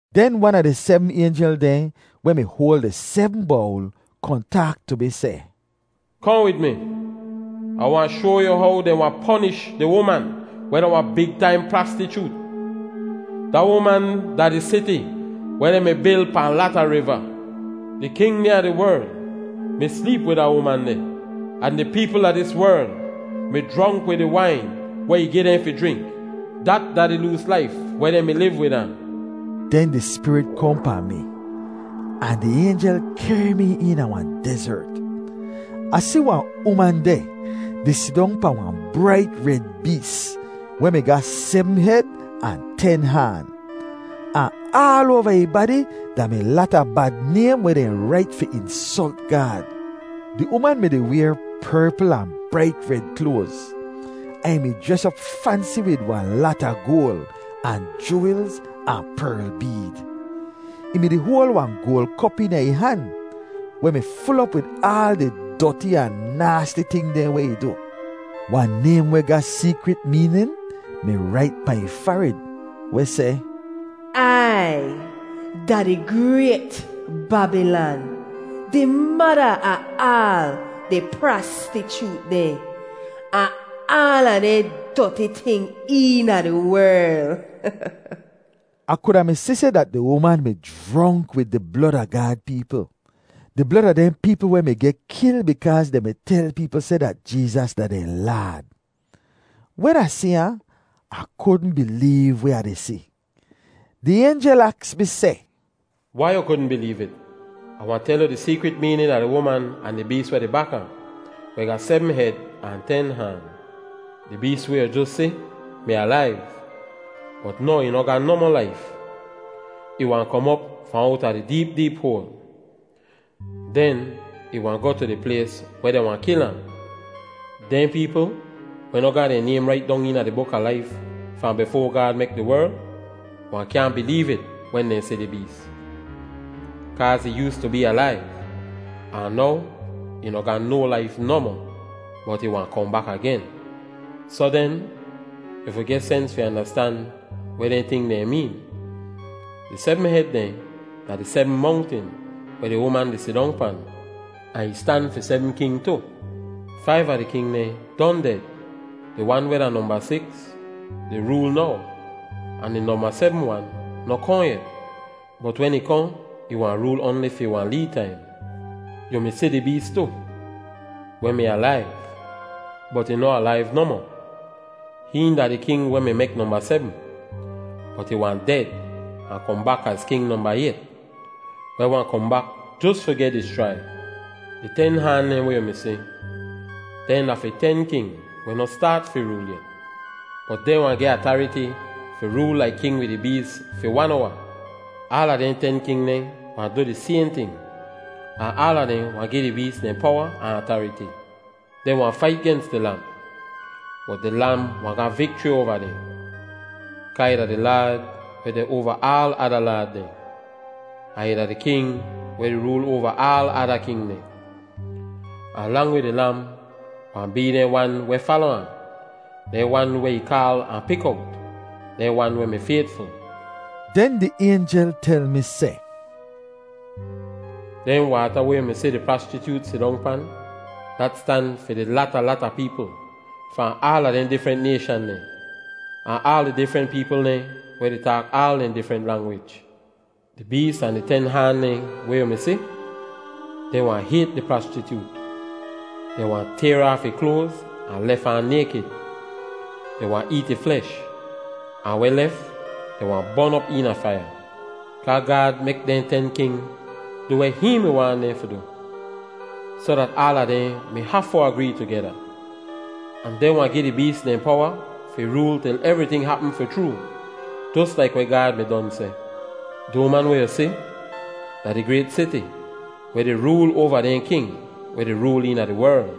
Den wan a di sebm aynjel dehn weh mi hoal di sebm bowl kohn taak tu mi seh, “Kohn wid mi. Ah wahn shoa yu how dehn wahn ponish di uman weh da wahn big taim prastichoot. Da uman da di siti weh dehn mi bil pahn lata riva. Di king dehn a di werl mi sleep wid da uman deh, ahn di peepl a dis werl mi jronk wid di wain weh ih gi dehn fi jrink. Dat da di loos laif weh dehn mi liv wid ahn.” Den di Spirit kohn pahn mi, ahn di aynjel kehr mi eena wahn dezert. Ah si wahn uman deh di sidong pahn wahn brait red bees weh mi ga sebm hed ahn ten haan. Ahn aal oava ih badi da mi lata bad naym weh dehn rait fi insolt Gaad. Di uman mi-di wayr perpl ahn brait red kloaz, ahn ih mi jres op fansi wid wahn lata goal, ahn juwelz, ahn perl beed. Ih mi-di hoal wahn goal kop eena ih han, weh mi ful op wid aal di doti ahn naasti ting dehn weh ih du. Wahn naym weh ga seekrit meenin mi rait pahn ih farid, weh seh, Ai da di grayt babilan Di mada a aal di prastichoot dehn Ahn aala dehn doti ting eena di werl. Ah kuda mi si seh dat di uman mi jronk wid di blod a Gaad peepl, di blod a dehn peepl weh mi geh kil bikaaz dehn mi tel peepl seh dat Jeezas da dehn Laad. Wen Ah si ahn, Ah kudn bileev weh Ah di si. Di aynjel aks mi seh, “Wai yu kudn bileev it? Ah wahn tel yu di seekrit meenin a di uman ahn di bees weh di bak ahn, weh ga sebm hed ahn ten haan. Di bees weh yu jos si mi alaiv, bot now ih noh ga nohmoh laif. Ih wahn kom op fahn owta di deep deep hoal. Den ih wahn goh tu di plays weh dehn wahn kil ahn. Dehn peepl, weh noh ga dehn naym rait dong eena di buk a laif fahn bifoa Gaad mek di werl, wahn kyaahn bileev it wen dehn si di bees. Kaaz ih yoostu bee alaiv, ahn now ih noh ga no laif nohmoh, bot ih wahn kohn bak agen. “Soh den, yu fi geh sens fi andastan weh dehn ting dehn meen. Di sebm hed dehn da di sebm mongtin weh di uman di sidong pan. Ahn ih stan fi sebm king tu. Faiv a di king dehn don ded. Di wan weh da nomba siks di rool now ahn di nomba sebm wan noh kohn yet, bot wen ih kohn, ih wahn rool oanli fi wahn lee taim. Yu mi si di bees tu, weh mi alaiv, bot ih noh alaiv nohmoh; hihn da di king weh mi mek nomba sebm, bot ih wahn ded ahn kohn bak az king nomba ayt, weh wahn kohn bak jos fi geh dischrai. “Di ten haan dehn weh yu mi si, dehn da fi ten king weh noh staat fi rool yet. Bot dehn wahn geh atariti fi rool laik king wid di bees fi wan owa. Aala dehn ten king dehn wahn du di sayhn ting, ahn aala dehn wahn gi di bees dehn powa ahn atariti. Dehn wahn fait gens di Lam, bot di Lam wahn ga vikchri oava dehn, kaa ih da di Laad weh deh oava aal ada laad dehn, ahn ih da di King weh di rool oava aal ada king dehn. Ahn lang wid di Lam wahn bee dehn wan weh fala ahn, dehn wan weh ih kaal ahn pik owt, dehn wan weh mi faytful.” Den di aynjel tel mi seh, “Dehn waata weh yu mi si di prastichoot sidong pan, dat stan fi di lata, lata peepl fahn aala dehn difrent nayshan dehn, ahn aal di difrent peepl dehn weh di taak aal dehn difrent langwij. Di bees ahn di ten haan dehn weh yu mi si, dehn wahn hayt di prastichoot. Dehn wahn tayr aaf ih kloaz ahn lef ahn naykid. Dehn wahn eet ih flesh, ahn weh lef, dehn wahn bon op eena faiya. Kaa Gaad mek dehn ten king du weh hihn mi waahn dehn fi du, soh dat aala dehn mi hafu agree tugeda. Ahn dehn wahn gi di bees dehn powa fi rool til evriting hapm fi chroo jos laik weh Gaad mi don seh. “Di uman weh yu si, da di grayt siti weh di rool oava dehn king weh di rool eena di werl.”